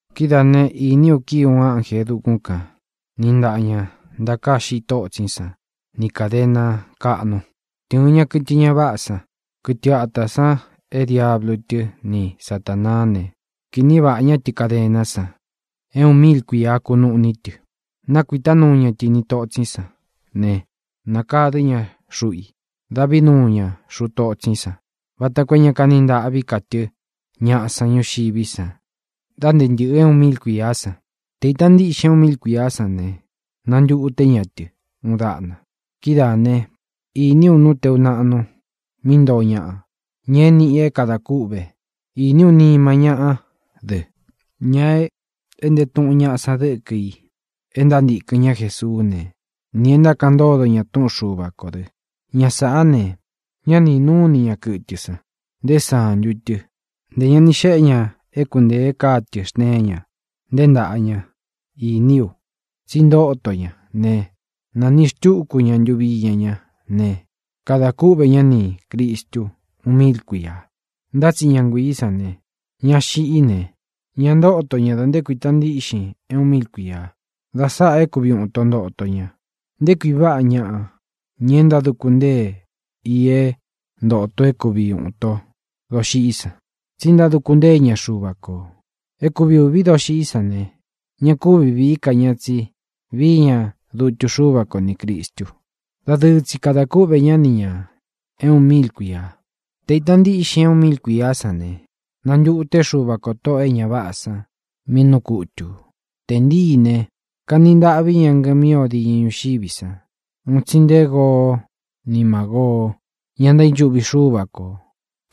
Kidáā né, īní u kíi uun ánjē e dukún kān, niꞌi ntaꞌa ña ntakāá xiꞌi tótsín san ni kādena káꞌnu. Tɨ̄ɨn ña kɨtɨ ña váꞌā san, kɨtɨ ata san é diablu tɨ́ ni Satānaá ne, kīꞌní vaꞌā ñá tɨ kadená san, é uun míil kuīa kunuꞌní tɨ. Nākuitá nuu ña tɨ ini totsín san ne, nakadɨ̄ ñá xuꞌu i. Dávī nuu ña xuꞌu totsín san vata koo é ña kani ntaꞌví ka tɨ́ ñaꞌa san ñuxiví san da nté ntɨ̄ꞌɨ é uun míil kuīá san. Te īta ntíꞌxin é uun míil kuīá san ne, nantuté ña tɨ uun daꞌna. Kidáā né, īní u nú teu naꞌnu, mí ntoo ñaꞌa, ña é nīꞌi i é kadā kûꞌve. Īní u nima ñáꞌa dɨ́, ña e éꞌnte tuꞌun ñaꞌa san dɨ́kɨ i e ntántīkɨn ñá Jesuú ne, nī é ntákaꞌan ntódo ña túꞌun Xuva kō dɨ. Ña sāꞌá ne, ñá ni īnúu ini ña kɨtɨ san, nté santu tɨ; ntē ña ni xéꞌe ña é kuntēe káa tɨ̄ xteen ña, nté ntāꞌa ña. Īní u tsi ntóto ña ne, nāniꞌi xtúku ña ntuvi iña ñá ne, kada kúꞌvē ñá nī Cristu uun míil kuīa. Ntá tsi ña nguiī sán, ña xiꞌí ne, ña ntóto ña dā nté kuīta ntíꞌxin é uun míil kuīa. Da sáꞌā é kuvi ūun ito ntoto ña. ¡Nté kui váꞌa ñāꞌa, ña é ntáduku ntée i é ntōto é kuvi ūun ito doxiꞌí san, tsí ntáduku ntée ña Xuva kō! É kuvi ūví doxiꞌí san ne, ña kúvi vīí ka ni ñā, tsi víi ña dutu Xúva ko nī Cristu. Dadɨɨ tsi kadā kúꞌvē ñá ni ñā é uun míil kuīa. Tē kúvi ita ntíꞌxin é uun míil kuīá san ne, nantūté Xuva kō tóꞌō e ña váꞌā san mí nuu kutū. Tē ntíi ne, kani ntaꞌví ñaꞌa ngɨmí o diñɨ ñuxiví san, un tsi nté Goo ni Mágoo, ña ntaínchuꞌvi Xúva ko,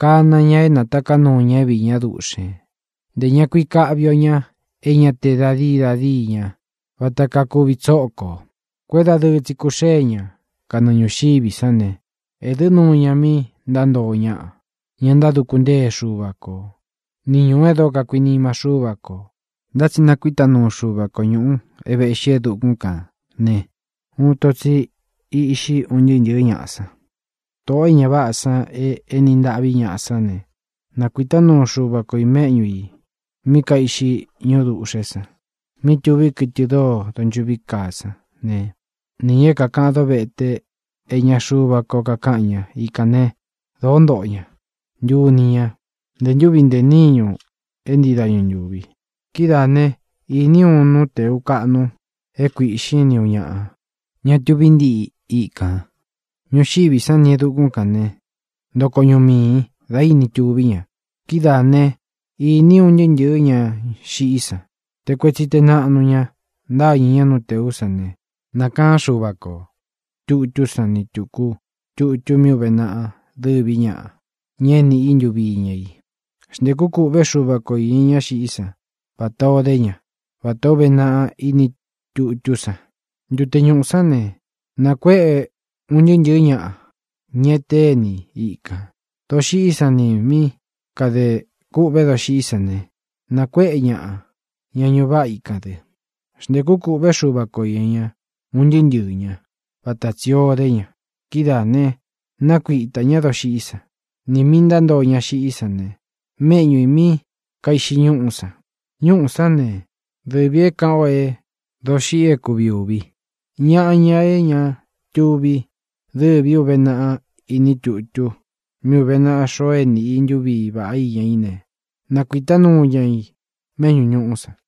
kāna ña é natāká nuu ña é viī ñá duꞌxēn; ntē ña kui káꞌvi o ña é ña te da dii da díi ña, vata kaa kuvi tsókō. Kuédadɨɨ tsi kūxée ña kanɨɨ ñūxiví san ne, ēdɨ́ nuu ña mi ntántoo ñaꞌa, ña ntáduku ntée Xuva ko, ni ñūú e dóo kakuinima Xúva kō. Ntá tsi kuíta nuu Xuva ko ñūꞌu é vēꞌxí nte e dukún kān ne, uun ito tsi íꞌxi un ntɨɨ́ ntɨ̄ɨ́ ñaꞌa san. Tōꞌo é ña váꞌā san e éni ntaꞌví ñaꞌa sán ne, nákuītá nuu Xuva ko i mēꞌñú i mí kaiꞌxi ñúꞌu dūꞌxé san, mí tuví kɨtɨ dóo donchuꞌví kaa san ne, nī ña é kākaꞌan dóvete é iña Xuva ko kakáꞌan ña. Ikān né, dōó ntoꞌo ña, ntuni ñá, ntē ntúvi ntē níñu é ntii dañu ntūvi. Kidáā né, īní u uun nú tēu kaꞌnu é kuīꞌxín, ni ūun ñaꞌa, ña tuví ntiꞌi ikān. Ñuxiví san nī e dukún kān né, ntoko ñuꞌu miī dá ini tuví ña. Kidáā né, īní u un ntɨɨ́ ntɨ̄ɨ́ ña xiꞌí san, te kuetsi te naꞌnu ña, ntáñɨ̄ ñá nú tēú san. Ne, nākaán Xuva ko tūtú san ni tūku tutu mí ūve naꞌa dɨ́ví ñaꞌa, ña é nīꞌi i ntuvi íña i. Xntēkú kūꞌvé Xuva ko īña ña xiꞌí san vatā o dé ña, vatā ó uve naꞌa ini tutú san. Ntute ñuꞌū sán ne, nakuéꞌe un ntɨɨ́ ntɨ̄ɨ́ ñaꞌa, ña é teni iní i kān. Doxiꞌí san nī mí kadē kûꞌvé doxiꞌí san ne, nakuéꞌe ñaꞌa, ña ñuꞌu váꞌa íkān dɨ. Xntēkú kūꞌvé Xuva ko īña ña, un ntɨɨ́ ntɨɨ̄ ñá, vata tsī o dé ña. Kidáā né, nakuitā ñá doxiꞌí san, nī mi ntántoo ña xiꞌí san méꞌñu ī mí kaiꞌxi ñúꞌú san. Ñúꞌū sán ne, dɨvī é kāꞌan o é doxiꞌi é kuvi ūvi. Ñaꞌa, ña é ña tuvi dɨ́vī í uve naꞌa ini tutu mí uve naꞌa xoo é nīꞌi i ntuví vaꞌá iña í ne, nakuītá nuu ña ī méꞌñū ñuꞌú san.